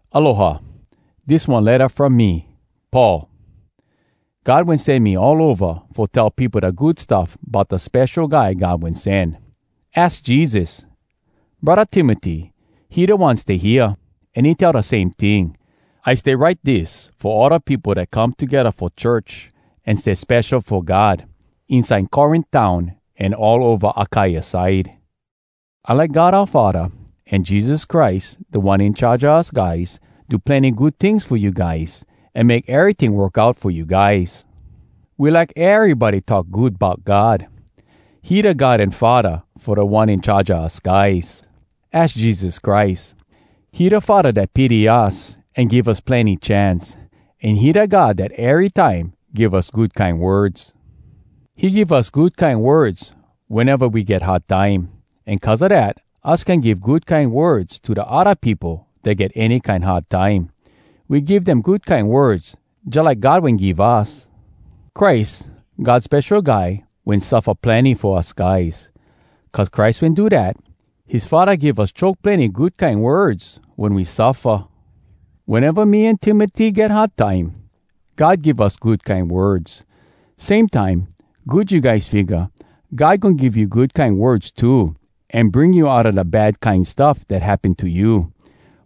Aloha! Dis one letta from me, Paul. God wen sen me all ova fo tell peopo da Good Stuff bout da Spesho Guy God Wen Sen. Az Jesus! Braddah Timoty, he da one stay hea, an he tell da same ting. I stay write dis fo all da peopo dat come togedda fo church an stay spesho fo God, inside Corint town an all ova Akaia side. I like God oua Faddah an Jesus Christ Da One In Charge a us guys do plenny good tings fo you guys an make eryting work out fo you guys. We like erybody talk good bout God. He da God an Faddah fo Da One In Charge a us guys, az Jesus Christ. He da Faddah dat pity us an give us plenny chance, an he da God dat erytime give us good kine words. He give us good kine words weneva we get hard time, an cuz a dat, us can give good kine words to da odda peopo dat get any kine hard time. We give dem good kine words jalike God wen give us. Christ, God Spesho Guy, wen suffa plenny fo us guys. Cuz Christ wen do dat, his Faddah give us choke plenny good kine words wen we suffa. Weneva me an Timoty get hard time, God give us good kine words. Same time, good you guys figga God goin give you good kine words too an bring you outa da bad kine stuff dat happen to you.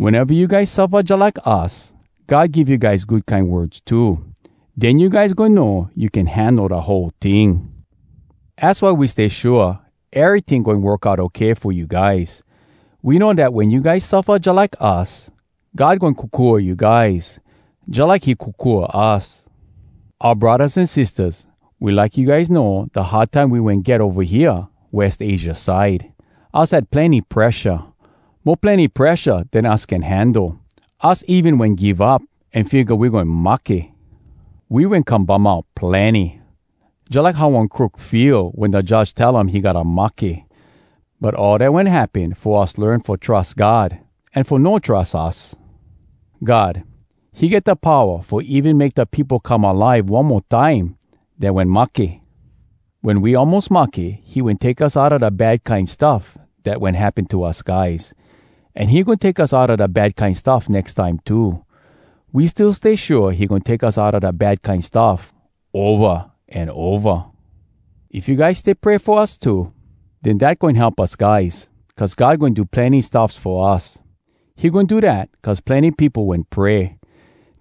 Weneva you guys suffa jalike us, God give you guys good kine words too. Den you guys goin know you can handle da whole ting. Az why we stay shua eryting goin work out okay fo you guys. We know dat wen you guys suffa jalike us, God goin kokua you guys jalike he kokua us. Oua braddahs an sistahs, we like you guys know da hard time we wen get ova hea West Asia side. Us had plenny presha, mo plenny presha den us can handle. Us even wen give up an figga we goin mahke. We wen come bum out plenny, jalike how one crook feel wen da judge tell um he gotta mahke. But all dat wen happen fo us learn fo trus God an fo no trus us. God, he get da powa fo even make da peopo come alive one mo time dat wen mahke. Wen we almos mahke, he wen take us outa da bad kine stuff dat wen happen to us guys. An he goin take us outa da bad kine stuff nex time too. We still stay shua he goin take us outa da bad kine stuff ova an ova. If you guys stay pray fo us too, den dat goin help us guys cuz God goin do plenny stuffs fo us. He goin do dat cuz plenny peopo wen pray.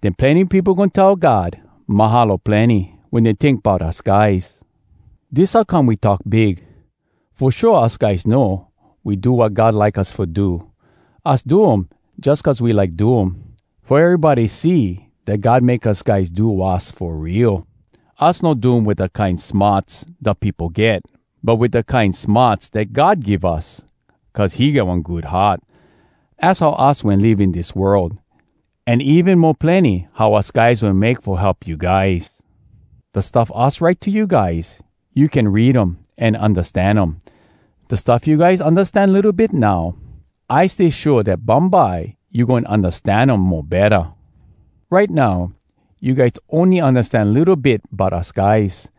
Den plenny peopo goin tell God “Mahalo plenny” wen dey tink bout us guys. Dis how come we talk big. Fo shua us guys know we do wat God like us fo do. Us do um jus cuz we like do um, fo erybody see dat God make us guys do wass fo real. Us no do um wit da kine smarts da peopo get, but wit da kine smarts dat God give us cuz he get one good heart. Az how us wen live in dis world, an even mo plenny how us guys wen make fo help you guys. Da stuff us write to you guys, you can read um an undastan um. Da stuff you guys undastan litto bit now, I stay shua dat bumbye you goin undastan um mo betta. Right now, you guys ony undastan litto bit bout us guys.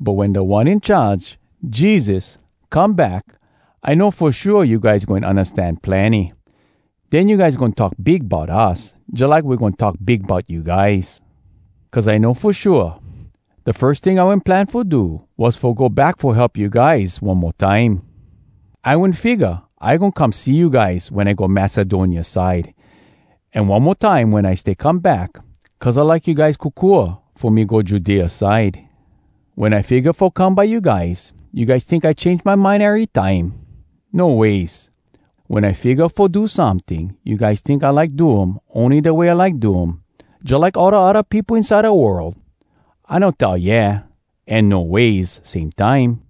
But wen Da One In Charge, Jesus, come back, I know fo shua you guys goin undastan plenny. Den you guys goin talk big bout us, jalike we goin talk big bout you guys. Cuz I know fo shua, da firs ting I wen plan fo do was fo go back fo help you guys one mo time. I wen figga I goin come see you guys wen I go Macedonia side, an one mo time wen I stay come back, cuz I like you guys kokua fo me go Judea side. Wen I figga fo come by you guys, you guys tink I change my mind erytime? No ways! Wen I figga fo do someting, you guys tink I like do um ony da way I like do um, jalike all da odda peopo inside da world? I no tell “Yeah!” an “No ways!” same time.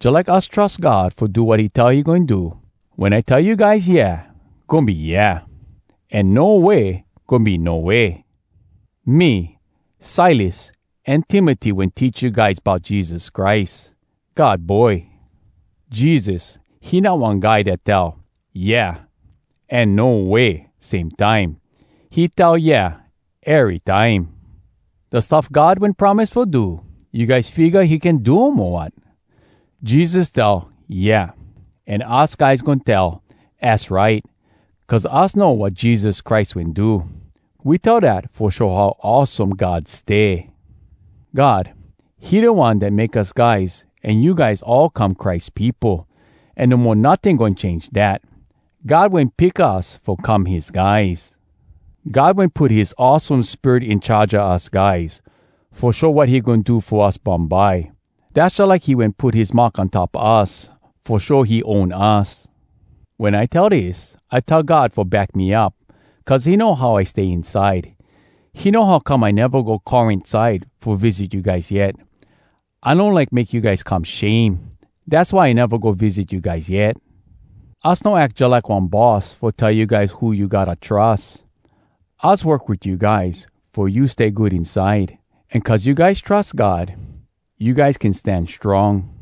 Jalike us trus God fo do wat he tell he goin do, wen I tell you guys “Yeah,” goin be “Yeah,” an “No way” goin be “No way.” Me, Silas, an Timoty wen teach you guys bout Jesus Christ, God Boy. Jesus, he not one guy dat tell “Yeah” an “No way” same time. He tell “Yeah” erytime! Da stuff God wen promise fo do, you guys figga he can do um, o wat?! Jesus tell, “Yeah!” An us guys goin tell, “Az right!” cuz us know wat Jesus Christ wen do. We tell dat fo show how awesome God stay. God, he da One dat make us guys an you guys all come Christ peopo, an no mo notting goin change dat. God wen pick us fo come his guys. God wen put his awesome Spirit in charge us guys fo show wat he goin do fo us bumbye. Dass jalike he wen put his mark on top us fo show he own us. Wen I tell dis, I tell God fo back me up, cuz he know how I stay inside. He know how come I neva go Corint side fo visit you guys yet. I no like make you guys come shame, dass why I neva go visit you guys yet. Us no ack jalike one boss fo tell you guys who you gotta trus. Us work wit you guys fo you stay good inside. An cuz you guys trus God, you guys can stan strong.